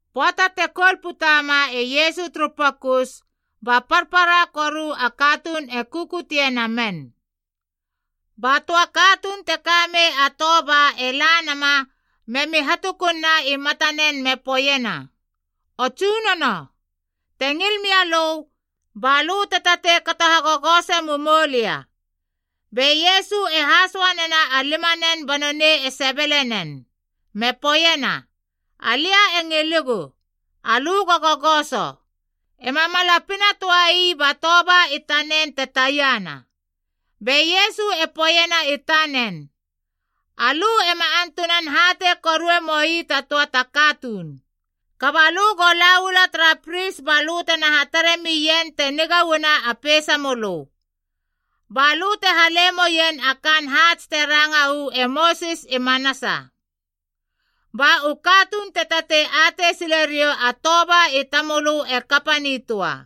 Pöata te koul putama e Iesu turu pokus ba parpara koru a katuun e kukutie nanen. Ba töa katuun te kamei a toba e la nama memi hatukunna i matanen me poeiena, “O Tsunono, te ngil mialö, balö te tatei kato hagogose mumoulia.” Be Iesu e hasoa nena a limanen ba nonei e sebele nen. Me poeiena, “Alia e ngilegu. Alö go gogoso!” Ema mala pinatöai ba toba i tanen te taiana. Be Iesu e poeiena i tanen, “Alö ema antunan hatei korue moi ta töa ta katuun. Kaba lö go la uala tara pris balö tena hatare mien te niga uana a peisamölö. Ba lö te hale moien a kaan haats te ranga uu e Mosis i manasa. Ba u katuun te tatei atei sile riou a toba i tamölö e kapa nitöa.”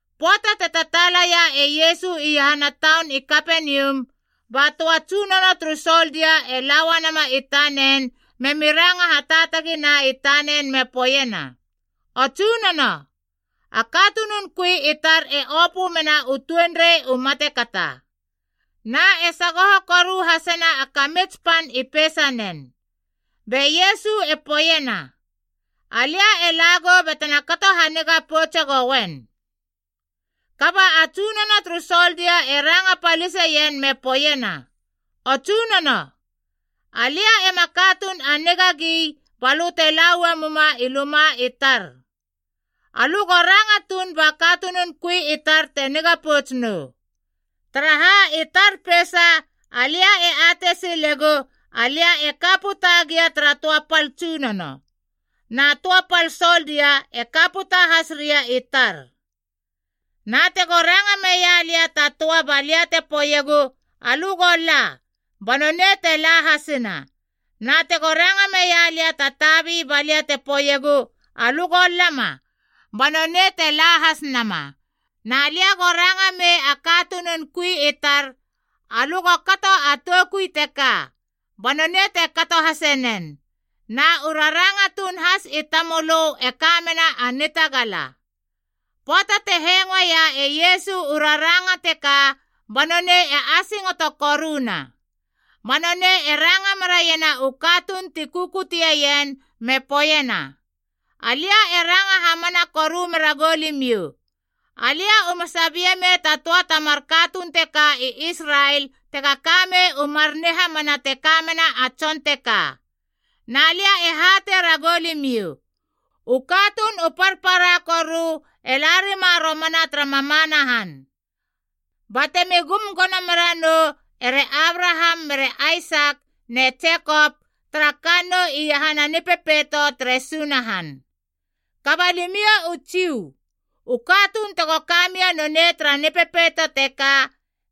Pöata te tataalaia e Iesu iahana taun i Kapenium, ba töa tsunono turu soldia e la uanama i tanen memi ranga hataatagina i tanen me poeiena, “O Tsunono, a katunun kui i tar e opö mena u tuenrei u matekata, na e sagoho koru hasena a kamits pan i peisanen.” Be Iesu e poeiena, “Alia e lagou batena kato haniga poutse goien.” Kaba a tsunono turu soldia e ranga paliseien me poeiena, “O Tsunono, alia ema katuun a nigagi balö te laua muma i luma i tar. Alö go ranga tuun ba katunun kui i tar te niga pouts nou. Taraha, i tar peisa alia e atei silegu alia e ka puta gia tara töa pal tsunono, na töa pal soldia e ka puta has ria i tar. Na tego ranga meia lia ta töa balia te poeiegu, ‘Alö go la,’ ba nonei te la hasina. Na tego ranga meia lia ta tabi balia te poeiegu, ‘Alö go lama,’ ba nonei te la has nama. Na lia go ranga mei a katunun kui i tar, ‘Alö go kato a toukui teka,’ ba nonei te kato hase nen. Na u raranga tuun has i tamölö e ka mena a nitagala.” Pöata te hengoeia e Iesu u raranga teka ba nonei e asingoto koruna. Ba nonei e ranga meraiena u katuun ti kukutieien me poeiena, “Alia e ranga hamana koru meragou limiou, alia uma sabie mei ta töa ta mar katuun teka i Israel tega kamei u mar nihamana te kamena a tson teka. Na lia e hatei ragou limiou, u katuun u parpara koru e la rima romana tara mamana han. Batemi gum gono mera nou ere Abraham mere Aisak ne Jekop tara kannou iahana a Nipepeito tere Sunahan. Kaba limiou u Jiu, u katuun tego kamia nonei tara Nipepeito teka,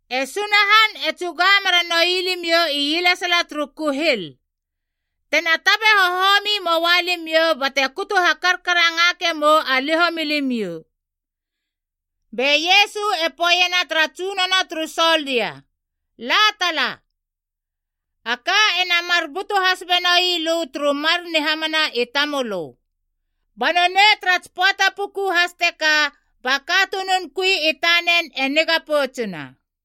e Sunahan e tsuga mera noi limiou ielesala turu kuhil. Tena tabe hohomi moua limiou bate kutu hakarkarangake mou a liho milimiou.” Be Iesu e poeiena tara tsunono turu soldia, “La tala. A ka ena mar butu has benoi lö turu mar nihamana i tamölö.” Ba nonei tara tsi pöata puku has teka ba katunun kui i tanen e niga poutsuna.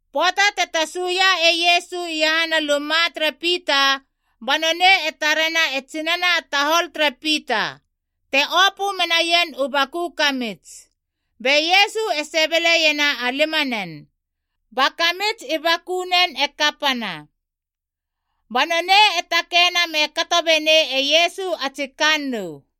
Pöata te tasuia e Iesu iahana luma tere Pita ba nonei e tarena e tsinana a tahol tere Pita, te opö menaien u baku kamits. Be Iesu e sebeleiena a limanen, ba kamits i bakunen e kapana. Ba nonei e takeina me kato benei e Iesu a tsi kannou.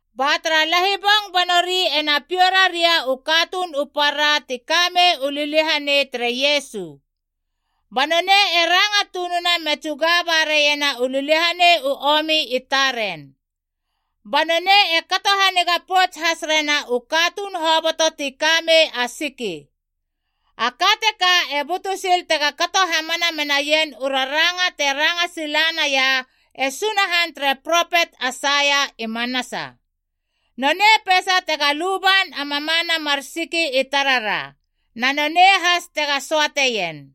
Ba tara lahibong ba nori ena piou raria u katuun u para ti kamei u liliahanei, tere Iesu. Ba nonei e ranga tununa me tsuga baraiena u liliahanei u omi i taren. Ba nonei e kato haniga pouts has rena u katuun hoboto ti kamei a siki. A ka teka e butu sil tega kato hamana menaien u raranga te ranga sila naia e Sunahan tere propet Aisaia i manasa. “Nonei peisa tega luban a mamana mar siki i tarara, na nonei has tega söateien.”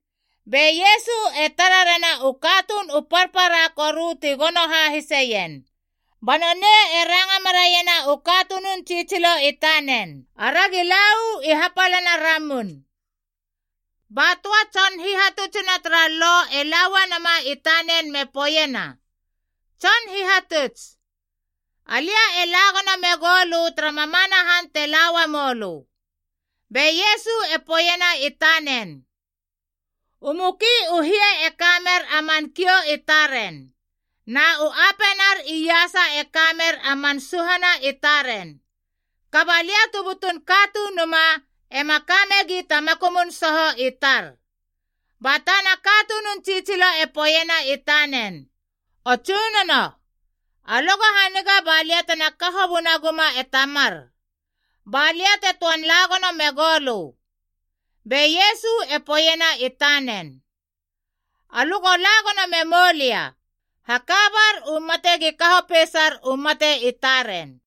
Be Iesu e tara rena u katuun u parpara koru ti gono hahiseien, ba nonei e ranga meraiena u katunun tsitsilo tanen, “Aragi la u i hapalana ramun.” Ba töa tson hihatutsuna tara Lo e la uanama i tanen me poeiena, “Tson Hihatuts, alia e la gono megou lö tara mamana han te la uamou lö.” Be Iesu poeiena i tanen, “U muki u hie e kamer a man kiou i taren, na u apenar iasa e kamer a man suhana i taren. Kaba lia tu butun Katunuma, ema kamegi ta makumun soho i tar.” Ba tana katunun tsitsilo e poeiena i tanen, “O Tsunono, alö go haniga balia tena kaho bunaguma e tamar, balia te töan lagono megou lö.” Be Iesu e poeiena i tanen, “Alö go la gono memou lia. Hakabar u mate gi kaho peisar u mate i taren.”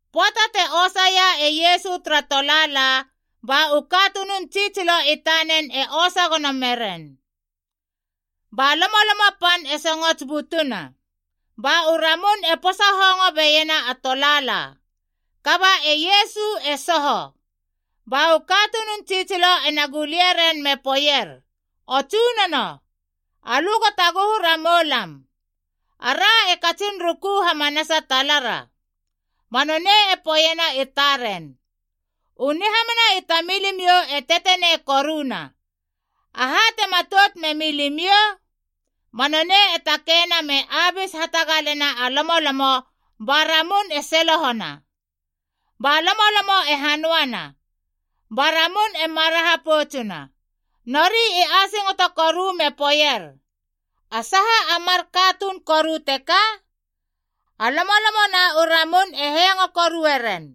Pöata te osaia e Iesu tara tolaala, ba u katunun tsitsilo i tanen e osa gono meren. Ba lomolomo pan e songots butuna, ba u ramun e posa hongo beiena a tolaala. Kaba e Iesu e soho. Ba u katunun tsitsilo ena gulie ren me poeier, “O Tsunono, alö go taguhu ramou lam! Ara e katsin ruku hamanasa talara!” Ba nonei e poeiena i taren, “U nihamana i tamilimiou e tetenei koruna! Aha te matout memilimiou?” Ba nonei e takeina me abis hatagalena a lomolomo ba ramun e selohona. Ba lomolomo e hanöana, ba ramun e maraha poutsuna. Nori i asingoto koru me poeier, “A saha a mar katuun koru teka? A lomolomo na u ramun e hengo korueren!”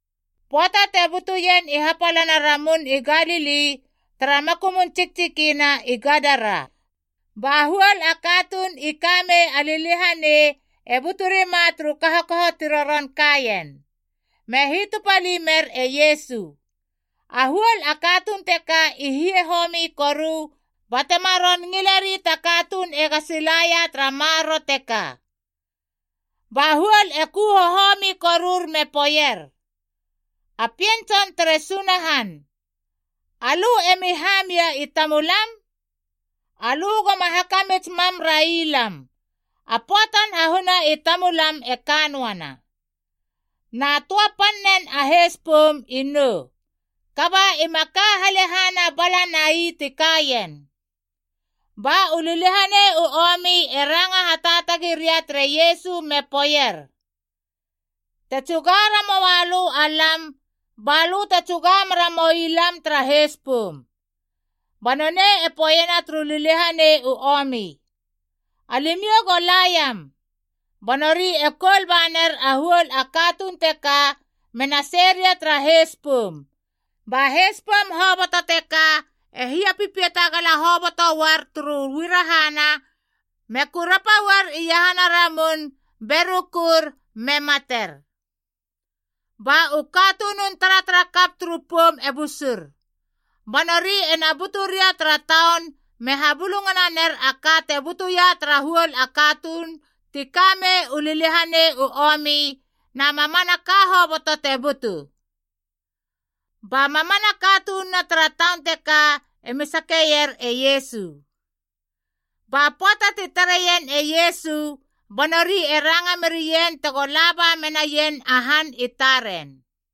Pöata te butuien i hapalana Ramun i Galili tara makumun tsiktsikina i Gadara. Ba huol a katuun i kamei a liliahanei e buturima turu kahokaho ti roron kaien, me hitupali mer e Iesu. A huol a katuun teka i hie homi koru batema ron ngileri ta katuun ega silaia tara maroro teka. Ba huol e ku hohomi korur me poeier, “A Pien Tson tere Sunahan, alö emi hamia i tamulam? Alö goma hakamits mam railam, a pöatan hahuna i tamulam e kanoana!” Na töa pannen a heis poum i nou, kaba ima ka halehana bala nai ti kaien. Ba u liliahanei u omi e ranga hataatagi ria tere Iesu me poeier, “Te tsuga ramoa lö alam, ba lö te tsuga mera moi lam tara heis poum.” Ba nonei e poeiena turu liliahanei u omi, “Alimiou go la iam.” Ba nori e koul ba ner a huol a katuun teka, mena sei ria tara heis poum. Ba heis poum hoboto teka e hiapipiata gala hoboto uar turu uarahana, me kurapa uar iahana a ramun be rukur me mater. Ba u katunun taratarakap turu poum e busur. Ba nori ena butu ria tara taun me habulungana ner a ka te butuia tara huol a katuun ti kamei u liliahanei u omi na mamanaka hoboto te butu. Ba mamana katununa tara taun teka emi sakeier e Iesu. Ba pöata ti tareien e Iesu ba nori e ranga merien tego la ba menaien a han i taren.